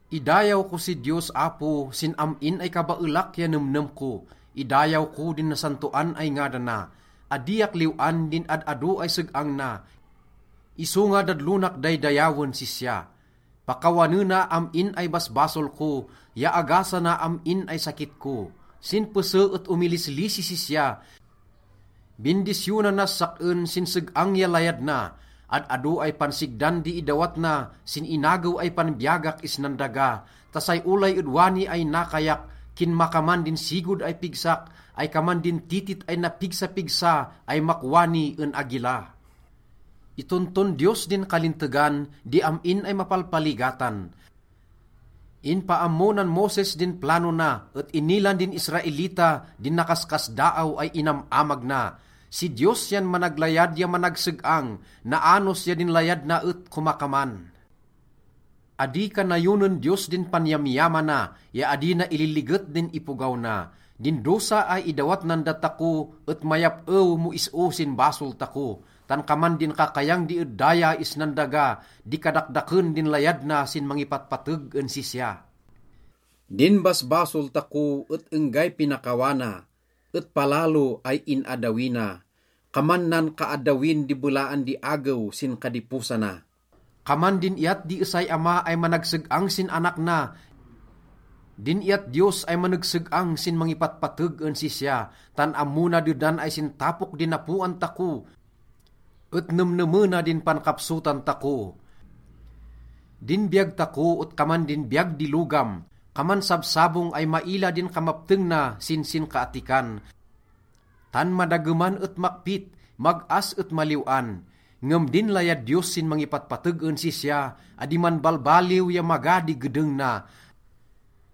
Idayaw ko si Diyos Apo sin am-in ay kabaelak ya nemnem ko. Idayaw ko din nasantoan ay ngadana. Adiak liw-an din ad-ado ay seg-ang na, isonga dadlonak daydayawen sisya. Pakawanena am-in ay basbasol ko ya agasana am-in ay sakit ko. Sin pese et omilislisi sisya. Bindisyonanas sak-en sin seg-ang ya layad na. Ad-ado ay pansigdan di idawat na sin inagew ay panbiyagak isnan daga ta say olay ed wani ay nakayak, kinmakaman din sigod ay pigsak ay kaman din titit ay napigsapigsa ay makwani en agila. Itonton Diyos din kalintegan di am-in ay mapalpaligatan. Inpaammo nan Moses din plano na, et inilan din Israelita din nakaskasdaaw ay inam-amag na. Si Diyos yan managlayad ya managseg-ang. Naanos ya din layad na et komakaman. Adi kanayonen Diyos din panyamyamana, ya adi na ililiget din ipogaw na. Din dosa ay idawat nan datako et mayap-ew mo is-o sin basol tako. Tan kaman din kakayang di ed daya isnan daga di kadakdaken din layad na sin mangipatpateg en sisya. Din basbasol tako et enggay pinakawana et palalo ay in-addawi na, kaman nan kaaddawin di belaan di agew sin kadiposana. Kaman din iyat di esay ama ay manegseg-ang sin anak na din iyat Diyos ay manegseg-ang sin mangipatpateg en sisya, tan ammo na dedan ay sin tapok di napoan tako, et nemnemena din pankapsotan tako. Din biyag tako et kaman din biyag di logam. Kaman sabsabong ay maila din kamapteng na sin sinkaattikan, tan madageman et makpit, mag-as et maliw-an. Ngem din layad Diyos sin mangipatpateg en sisya, adi manbalbaliw ya maga di gedeng na.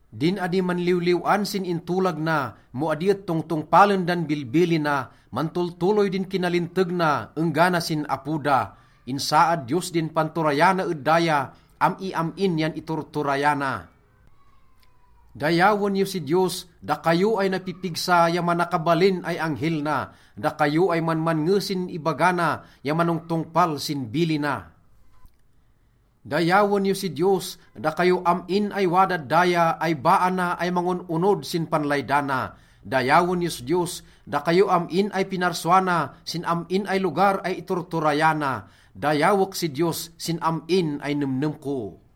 Din adi manliwliw-an sin intolag na mo adi et tongtongpalen dan bilbilina, mantoltoloy din kinalinteg na enggana sin apo da. Insaad Diyos din panturayana ed daya, am-iam-in yan iturturayana. Dayawen yo si Diyos, dakayo ay napipigsa ya manakabalin ay anghel na, dakayo ay manmannge sin ibaga na ya manongtongpal sin bilina. Dayawen yo si Diyos, dakayo am-in ay wadad daya ay baa na ay mangon-onod sin panlaydana. Dayawen yos Diyos, dakayo am-in ay pinarsua na sin am-in ay lugar ay iturturayana. Dayawek si Diyos sin am-in ay nemnem ko.